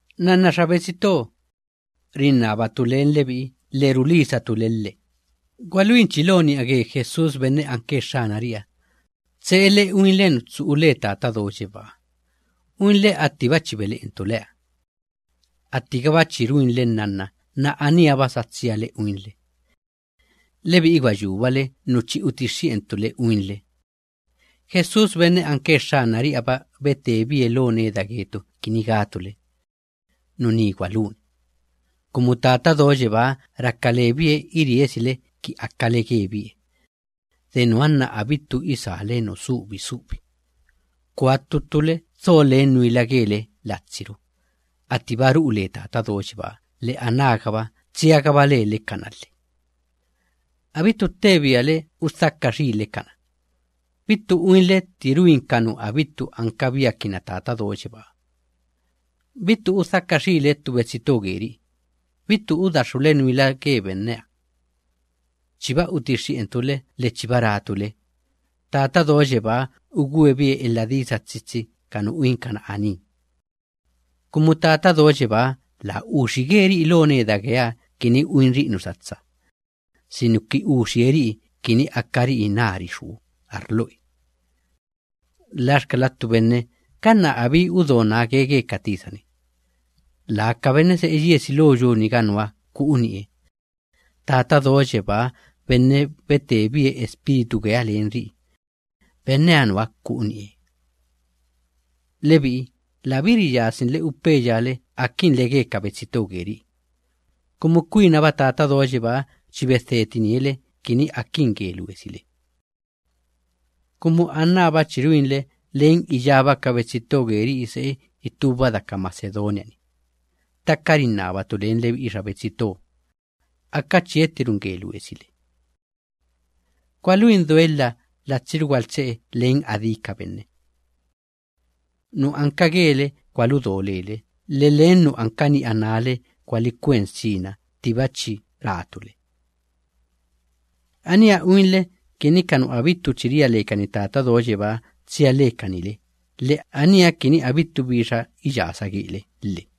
Nnanna xa betsi to, rinnabatu len lebi'i lhe rulisatu le lhe, gwaluinchi lo ni'a ge Jesús benne anke Xxanari'iha, tse'ele uinle nu tsu'u le Tata Do Yebáha, uinle attiba chi bele'entu leha. Attigaba chi ruinle nnanna, anába sa tsiarule uinle. Lebi'i gwa yúbale nu chi utixxi'entu le uinle. Jesús benne anke Xxanari'iha‑ba betebie lo neda getu kini gatu le: “Nuní gwaluni.” Kumu Tata Do Yebáha raka lebie iriesile ki akale gebie. De nuha nna abittu isále nu subi subi. Kua ttu ttule dho len nuila gele latsiru, attiba ru'u le Tata Do Yebáha lhe anágaba tsiagaba lele kana lhe. Abittu ttebiale udhaka xiile kana, bittu uinle tti ruin ka nu abittu ankabiakinna Tata Do Yebáha. Bittu udhaka xiile ttu betsi to geri'i, abittu udaxxule nuila ge benneha. Chiba utixxi'entu le lhe chiba ratu le, Tata Do Yebáha ugwebie elha disa tsitsi ka nu uinkana aní. Kumu Tata Do Yebáha laa uxige ri'i lo neda geeha kini uinri'i nu satsa, sinuki uxilee ri'i kini akari'i nari xú arloe. Laxkala ttu benne ganna abíba udo nage ge ka tisa‑ni, laa ka benne se'e yiesi lo yu‑niga nuha ku'u ni'e, Tata Do Yebaa benne betebie Espíritu geeha len ri'i, benneha nuha ku'u ni'e. Lebi'i labí riyasinle upeya le akinle ge ka betsi to geri'i, kumu kwinaba Tata Do Yebáha chi bedhetinie le kini akin ge luesile. Kumu anába chi ruinle len iyába ka betsi to geri'i se'e itúba daka Macedonia‑ni, ttaka rinnabatu len lebi'i xa betsi to, aka chiettiruin ge luesile. Gwaluin doelha latsiru gwaltse'e len adí ka benne. Nu anka gele gwaludo lele, lhe len nu anka ni'a nále gwalikwen sina ttiba chi ratu le. Aníha uinle kini ka nu abittu chi ria lekani Tata Do Yebáha tsia lekani le, lhe aníha kini abittu bi iyasa gele lhe.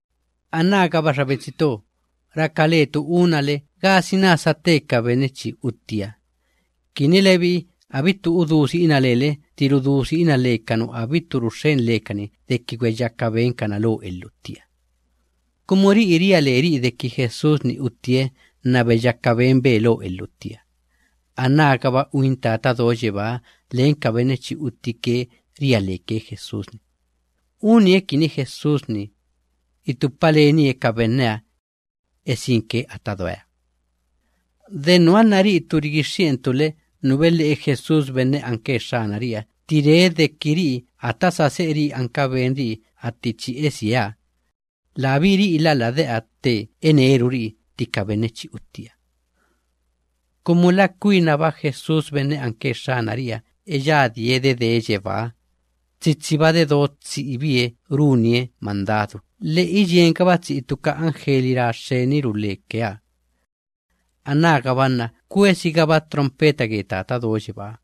Anágaba xa betsi to, raka letu unale, gasina sate ka benne chi uttiha, kini lebi'i abittu udú si'ina lele tti rudú si'ina le ka nu abittu ruxxen lekani deki gweyaka benkana lo elhuttiha. Kumu ri'i ria leri'i deki Jesús‑ni uttie nna beyaka benbe lo elhuttiha, anágaba uin Tata Do Yebáha len ka benne chi uttike ria leke ge Jesús‑ni, unie kini Jesús‑ni, itupa lenie ka benneha, esinke ata doeha. De nuha nna ri'itu rigixxi'entu le nu bele'e Jesús benne anke Xxanari'iha tti ree deki ri'i ata sa se'eri'i anka benri'i atti chi esieha, labí ri'ila lade'a tte eneruri'i tti ka benne chi uttiha. Kumu la kwinaba Jesús benne anke Xxanari'iha eyadie dedee yebáha, tsitsiba dedo tsi'ibie runie mandadu, lhe iyiengaba tsi'i ttu ka anjeli ra xxeniru lekeha. Anágaba nna kwesigaba trompeta ge Tata Do Yebáha.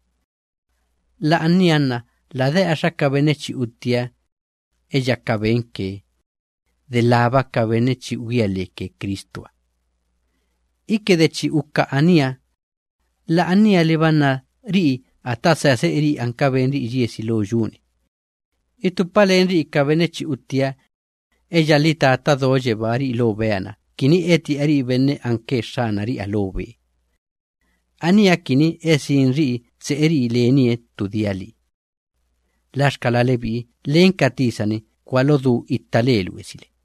La'ania nna lade'axa ka benne chi uttiha, eyaka benke, delába ka benne chi ugía leke Cristuha. Iki de chi uka aníha, la'anialiba nna ri'i ata sa se'eri'i anka benri'i yiesi lo yu‑ni, itupa lenri'i ka benne chi uttiha, eyalhi Tata Do Yebáha ri'i lo bea‑na kini eti'ari'i benne anke Xxanari'iha lo be. Aníha kini esinri'i tse'eri'i lenie ttu dia lii. Laxkala lebi'i len ka tisa‑ni gwalodú itta le luesile.